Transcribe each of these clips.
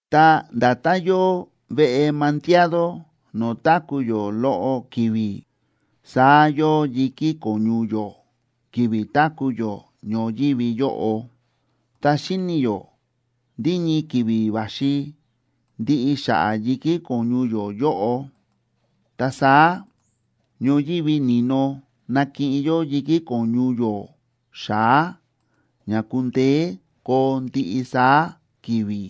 Ta nda̱tán yóo veꞌe mandiado no̱o̱ táku̱ yó loꞌo ki̱vi̱, saá yóo yi̱kí ko̱ñu yó ki̱vi̱ táku̱ yó ñoyívi yóꞌo. Ta xíni̱ yó ndí ñii ki̱vi̱ va̱xi ndiꞌi xa̱ꞌa̱ yi̱kí ko̱ñu yó yóꞌo. Ta saá ñoyívi ni̱no nakiꞌin yó yi̱kí ko̱ñu yó xa̱á ña kundeé koo ndiꞌi saá ki̱vi̱.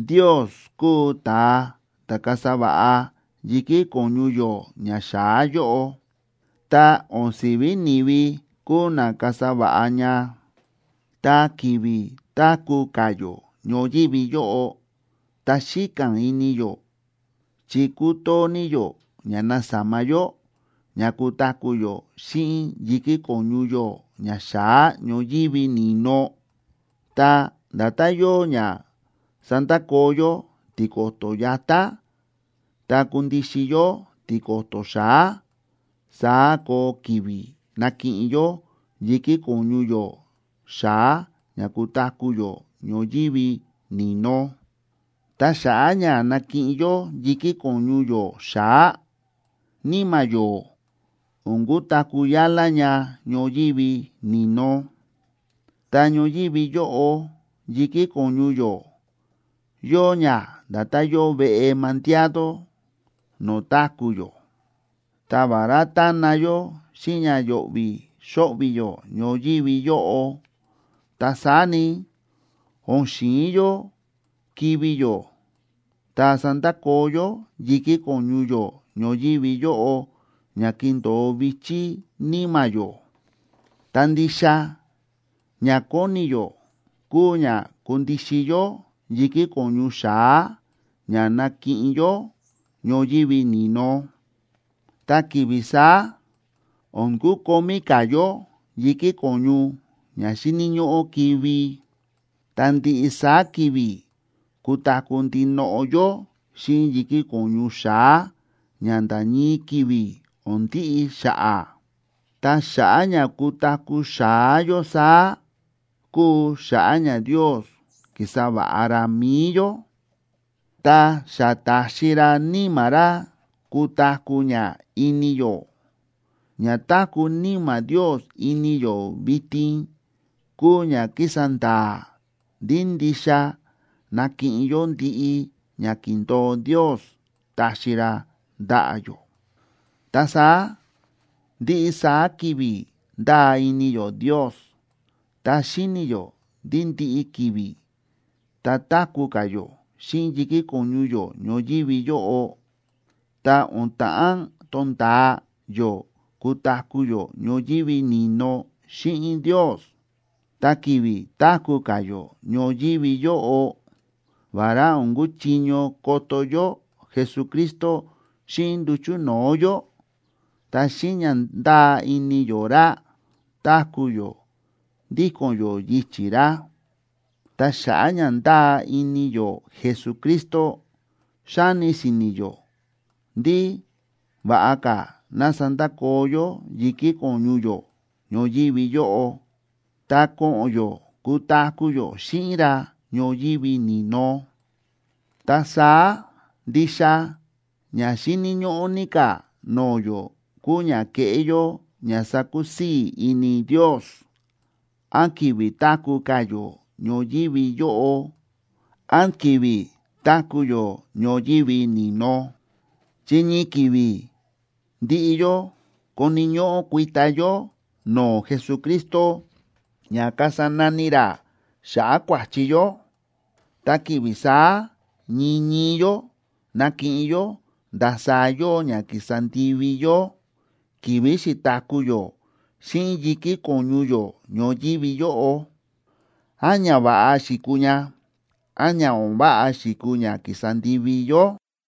Ndios kúu ta̱a ta̱ kasa va̱ꞌa yi̱kí ko̱ñu yó ñaxa̱á yóꞌo, ta o̱n si̱ví ni̱vi kúu na kasa va̱ꞌa ña. Ta ki̱vi̱ táku̱ ka̱ yó ñoyívi yóꞌo, ta xíka̱n ini yó, chi kútoo ní yó ña nasama yó ña kutaku̱ yó xíꞌin yi̱kí ko̱ñu yó ña xa̱á ñoyívi ni̱no. Ta nda̱tán yóo ña sa̱ndakoo yó tiko̱to̱ yatá ta kundixin yó tiko̱to̱ xa̱á, saá koo ki̱vi̱ nakiꞌin yó yi̱kí ko̱ñu yó xa̱á ña kutaku̱ yó ñoyívi ni̱no. Ta xa̱ꞌa̱ ña nakiꞌin yó yi̱kí ko̱ñu yó xa̱á, níma̱ yó o̱n kutaku̱ yálá ña ñoyívi ni̱no. Ta ñoyívi yóꞌo yi̱kí ko̱ñu yó, yóo ña nda̱tán yóo veꞌe mandiado no̱o̱ táku̱ yó. Ta vará tána yó xíꞌin ña yo̱ꞌvi̱ xóꞌvi̱ yó ñoyívi yóꞌo, ta saá ni, o̱n xi̱in yó kivi̱ yó ta sandakoo yó yi̱kí ko̱ñu yó ñoyívi yóꞌo ña kindo̱o vi̱chí níma̱ yó. Ta ndixa ña kóni yó kúu ña kundixin yó yi̱kí ko̱ñu xa̱á ña nakiꞌin yó ñoyívi ni̱no. Ta ki̱vi̱ saá o̱n kukomí ka̱ yó yi̱kí ko̱ñu ña xíni̱ ñóꞌó kivi̱, ta ndiꞌi saá ki̱vi̱ kutaku̱ ndinoꞌo yó xíꞌin yi̱kí ko̱ñu xa̱á ña nda̱ ñii ki̱vi̱ o̱n ndiꞌi xa̱ꞌa̱. Ta xa̱ꞌa̱ ña kutaku̱ xa̱á yó saá, kúu xa̱ꞌa̱ ña Ndios ki̱sa va̱ꞌa ra mi̱i yó, ta xa ta̱xi ra Níma̱ ra kutaku̱ ña ini yó. Ña táku̱ Níma̱ Ndios ini yó vitin kúu ña kísa nda̱a̱ ndí ndixa nakiꞌin yó ndiꞌi ña ki̱ndo̱o Ndios taxi ra ndaꞌa̱ yó. Ta saá ndiꞌi saá ki̱vi̱ ndáa ini yó Ndios, ta xíni̱ yó ndí ndiꞌi ki̱vi̱ tá táku̱ ka̱ yó xíꞌin yi̱kí ko̱ñu yó ñoyívi yóꞌo, ta o̱n ta̱ꞌán tonda̱a yó kutaku̱ yó ñoyívi ni̱no xíꞌin Ndios. Ta ki̱vi̱ táku̱ ka̱ yó ñoyívi yóꞌo, vará o̱n kúchiño koto yó Jesucristo xíꞌin nduchu̱ no̱o̱ yó, ta xíꞌin ña ndáa ini yó ra, táku̱ yó ndíko̱n yó yichi̱ ra. Ta xa̱ꞌa̱ ña ndáa ini yó Jesucristo, xáni si̱ni̱ yó ndí va̱ꞌa ka̱ ná sandakoo yó yi̱kí ko̱ñu yó ñoyívi yóꞌo, ta ko̱ꞌo̱n yó kutaku̱ yó xíꞌin ra ñoyívi ni̱no. Ta saá, ndixa ña xíni̱ ñóꞌó ní ka̱ no̱o̱ yó kúu ña kéꞌé yó ña sákusii̱ ini Ndios, án ki̱vi̱ táku̱ ka̱ yó ñoyívi yóꞌo, án ki̱vi̱ táku̱ yó ñoyívi ni̱no. Chi ñii ki̱vi̱ ndiꞌi yó koni̱ ñóꞌó kuita yó no̱o̱ Jesucristo ña kasa nani ra xa̱ꞌa̱ kua̱chi yó, ta ki̱vi̱ saá ñii ñii yó nakiꞌin yó ndasaá yóo ña ki̱sa ndivi yó ki̱vi̱ xi̱taku̱ yó xíꞌin yi̱kí ko̱ñu yó ñoyívi yóꞌo, án ñava̱ꞌa xi̱kuu ña, án ña o̱n váꞌa xi̱kuu ña ki̱sa ndivi yó.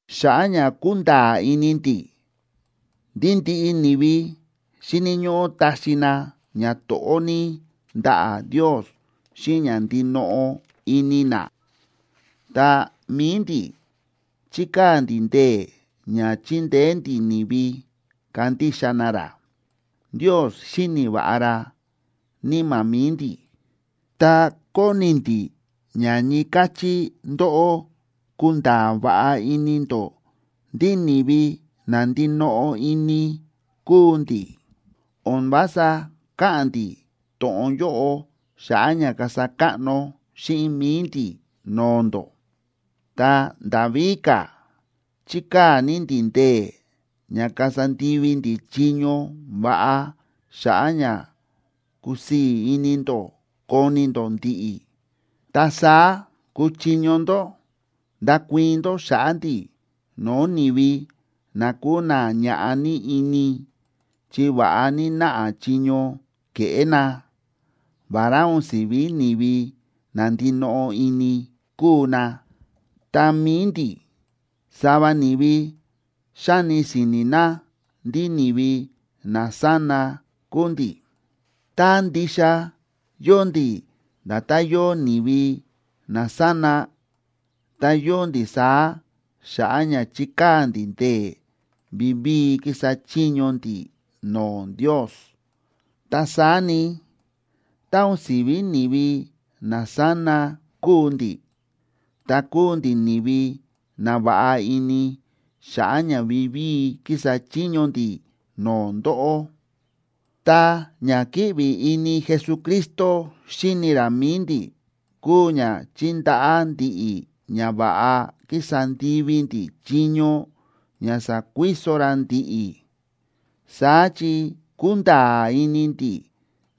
Xa̱ꞌa̱ ña kúnda̱a̱ ini ndi̱ ndí ndiꞌi ni̱vi xíni̱ ñóꞌó taxi na ñato̱ꞌó ní ndaꞌa̱ Ndios xíꞌin ña ndinoꞌo ini na, ta mi̱i ndi̱ chíkaa̱ ndi̱ ndee̱ ña chindeé ndi̱ ni̱vi kandixa na ra. Ndios xíni̱ va̱ꞌa ra níma̱ mi̱i ndi̱, ta kóni ndi̱ ña ñii káchí ndóꞌó kunda̱a̱ va̱ꞌa ini ndó ndí ni̱vi na ndinoꞌo ini kúu ndi̱. O̱n vása káꞌa̱n ndi̱ to̱ꞌon yóꞌo xa̱ꞌa̱ ña kasa káꞌno xíꞌin mi̱i ndi̱ no̱o̱ ndó. Ta nda̱ víka̱, chíkaa̱ ní ndi̱ ndee̱ ña kasa ndivi ndi̱ chiño va̱ꞌa xa̱ꞌa̱ ña kusii̱ ini ndó koni ndó ndi̱ꞌi̱. Ta saá kuchiño ndó ndakuii̱n ndó xa̱ꞌa̱ ndi̱ no̱o̱ ni̱vi na kúu na ñaꞌá ní ini chi va̱ꞌa ní náꞌa chiño ke̱ꞌé na, vará o̱n si̱ví ni̱vi na ndinoꞌo ini kúu na. Ta mi̱i ndi̱, sava ni̱vi xáni si̱ni̱ na ndí ni̱vi nasána kúu ndi̱. Tá ndixa yóo ndi̱ nda̱tán yóo ni̱vi nasána, ta yóo ndi̱ saá xa̱ꞌa̱ ña chíkaa̱ ndi̱ ndee̱ vivíi kísa chiño ndi̱ no̱o̱ Ndios. Ta saá ni, tá o̱n si̱ví ni̱vi nasána kúu ndi̱, ta kúu ndi̱ ni̱vi na va̱ꞌa ini xa̱ꞌa̱ ña vivíi kísa chiño ndi̱ no̱o̱ ndóꞌó. Ta ña kíꞌvi ini Jesucristo xíni ra mi̱i ndi̱ kúu ña chíndaꞌá ndi̱ꞌi̱ ña va̱ꞌa kísa ndivi ndi̱ chiño ña sa̱kuiso ra ndi̱ꞌi̱. Saá chi kúnda̱a̱ ini ndi̱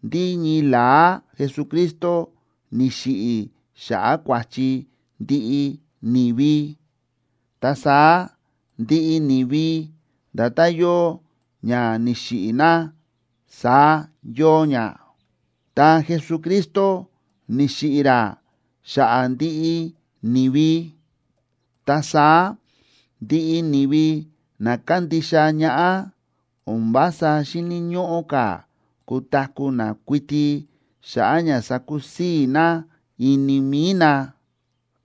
ndí ñii la̱á Jesucristo ni̱xiꞌi̱ xa̱ꞌa̱ kua̱chi ndiꞌi ni̱vi. Ta saá ndiꞌi ni̱vi nda̱tán yóo ña ni̱xiꞌi̱ na, saá yóo ña. Ta Jesucristo ni̱xiꞌi̱ ra xa̱ꞌa̱ ndiꞌi ni̱vi. Ta saá ndiꞌi ni̱vi na kándixa ñaꞌá o̱n vása xíni̱ ñóꞌó ka̱ kutaku̱ na kuiti xa̱ꞌa̱ ña sakusii̱ na ini mi̱i na,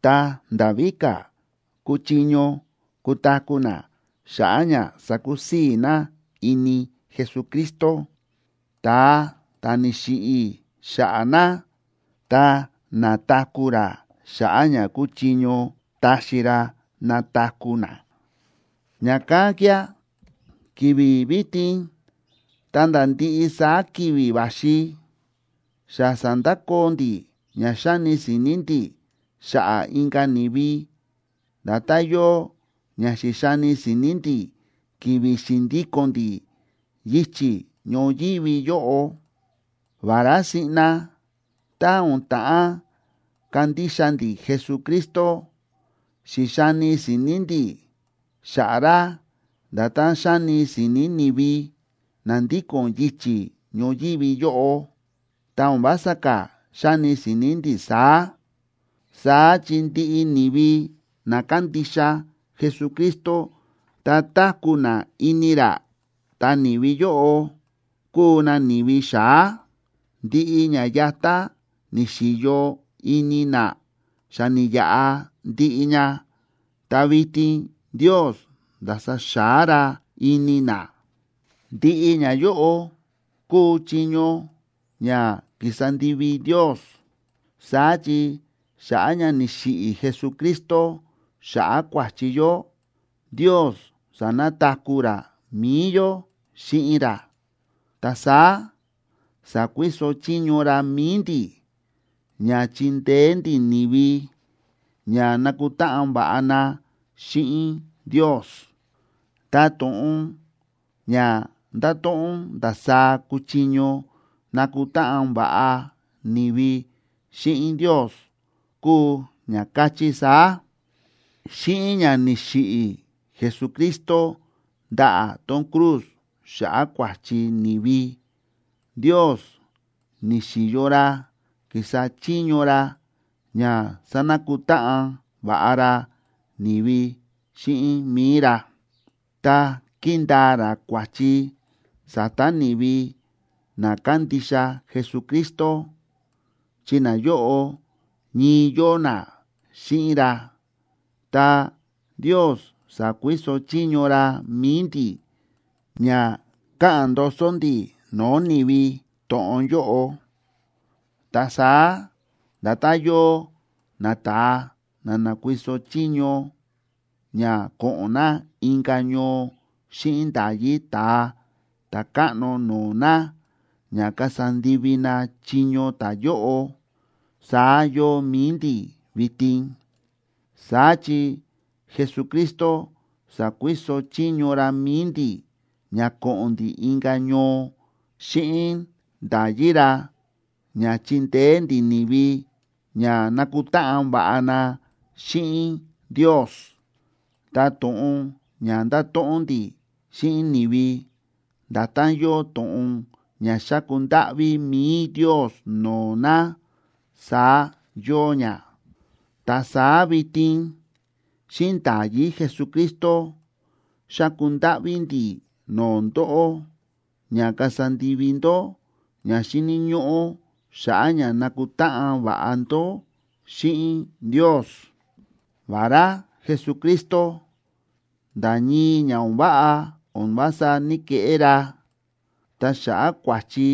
ta nda̱ víka̱, kúchiño kutaku̱ na xa̱ꞌa̱ ña sakusii̱ na ini Jesucristo, ta̱a ta̱ ni̱xiꞌi̱ xa̱ꞌa̱ na, ta na̱taku̱ ra xa̱ꞌa̱ ña kúchiño taxi ra nataku̱ na. Ña̱kán kía̱ ki̱vi̱ vitin ta̱nda̱ ndiꞌi saá ki̱vi̱ va̱xi, xa sa̱ndakoo ndi̱ ña xáni si̱ni̱ ndi̱ xa̱ꞌa̱ inka̱ ni̱vi nda̱tán yóo ña xi̱xani si̱ni̱ ndi̱ ki̱vi̱ xi̱ndíko̱n ndi̱ yichi̱ ñoyívi yóꞌo. Vará siꞌna tá o̱n ta̱ꞌán kandixa ndi̱ Jesucristo, xi̱xani si̱ni̱ ndi̱ xa̱ꞌa̱ ra nda̱tán xáni si̱ni̱ ni̱vi na ndíko̱n yichi̱ ñoyívi yóꞌo, ta o̱n vása ka̱ xáni si̱ni̱ ndi̱ saá. Saá chi ndiꞌi ni̱vi na kándixa Jesucristo ta táku̱ na ini ra, ta ni̱vi yóꞌo kúu na ni̱vi xa̱á. Ndiꞌi ña yatá ni̱xi̱yo ini na xa ni̱yaꞌa ndiꞌi ña, ta vitin Ndios nda̱sa xa̱á ra ini na. Ndiꞌi ñayóꞌo kúu chiño ña ki̱sa ndivi Ndios. Saá chi xa̱ꞌa̱ ña ni̱xiꞌi̱ Jesucristo xa̱ꞌa̱ kua̱chi yó, Ndios sa̱nakutáꞌan ra mi̱i yó xíꞌin ra. Ta saá sa̱kuiso chiño ra mi̱i ndi̱ ña chindeé ndi̱ ni̱vi ña nakutáꞌan váꞌa na xíꞌin Ndios. Ta to̱ꞌon ña ndáto̱ꞌon ndasaá kúchiño nakutáꞌan va̱ꞌa ni̱vi xíꞌin Ndios kúu ña káchí saá: Xíꞌin ña ni̱xiꞌi̱ Jesucristo ndaꞌa̱ tón cruz xa̱ꞌa̱ kua̱chi ni̱vi, Ndios ni̱xi̱yo ra kísa chiño ra ña sánakutáꞌan va̱ꞌa ra ni̱vi xíꞌin mi̱i ra, ta kíndaa ra kua̱chi sa̱ta̱ ni̱vi na kándixa Jesucristo, chi nayóꞌo ñii yóo na xíꞌin ra. Ta Ndios sa̱kuiso chiño ra mi̱i ndi̱ ña káꞌa̱n ndoso ndi̱ no̱o̱ ni̱vi to̱ꞌon yóꞌo. Ta saá nda̱tán yóo nata̱a na na̱kuiso chiño ña ko̱ꞌo̱n na inka̱ ñoo xíꞌin nda̱yí ta̱a ta̱káꞌno no̱o̱ na ña kasa ndivi na chiño ta̱yóꞌo, saá yóo mi̱i ndi̱ vitin. Saá chi Jesucristo sa̱kuiso chiño ra mi̱i ndi̱ ña ko̱ꞌo̱n ndi̱ inka̱ ñoo xíꞌin nda̱yí ra ña chindeé ndi̱ ni̱vi ña nakutáꞌan va̱ꞌa na xíꞌin Ndios. Ta to̱ꞌon ña ndáto̱ꞌon ndi̱ xíꞌin ni̱vi, nda̱tán yóo to̱ꞌon ña xáku ndáꞌví mi̱i Ndios no̱o̱ na, saá yóo ña. Ta saá vitin xíꞌin nda̱yí Jesucristo, xáku ndáꞌví ndi̱ no̱o̱ ndóꞌó ña kasa ndivi ndó ña xíni̱ ñóꞌó xa̱ꞌa̱ ña nakutáꞌan va̱ꞌa ndó xíꞌin Ndios. Vará Jesucristo nda̱ ñii ña o̱n váꞌa o̱n vása ní‑keꞌé ra, ta xa̱ꞌa̱ kua̱chi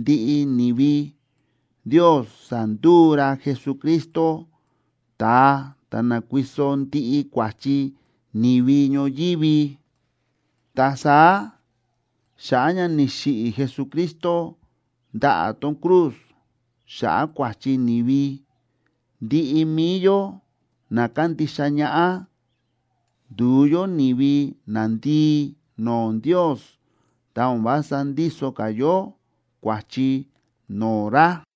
ndiꞌi ni̱vi, Ndios sa̱nduu ra Jesucristo ta̱a ta̱ na̱kuiso ndiꞌi kua̱chi ni̱vi ñoyívi. Ta saá xa̱ꞌa̱ ña ni̱xiꞌi̱ Jesucristo ndaꞌa̱ tón cruz xa̱ꞌa̱ kua̱chi ni̱vi, ndiꞌi mi̱i yó na kándixa ñaꞌá, ndu̱u yó ni̱vi nandii no̱o̱ Ndios ta o̱n vása ndíso ka̱ yó kua̱chi no̱o̱ ra.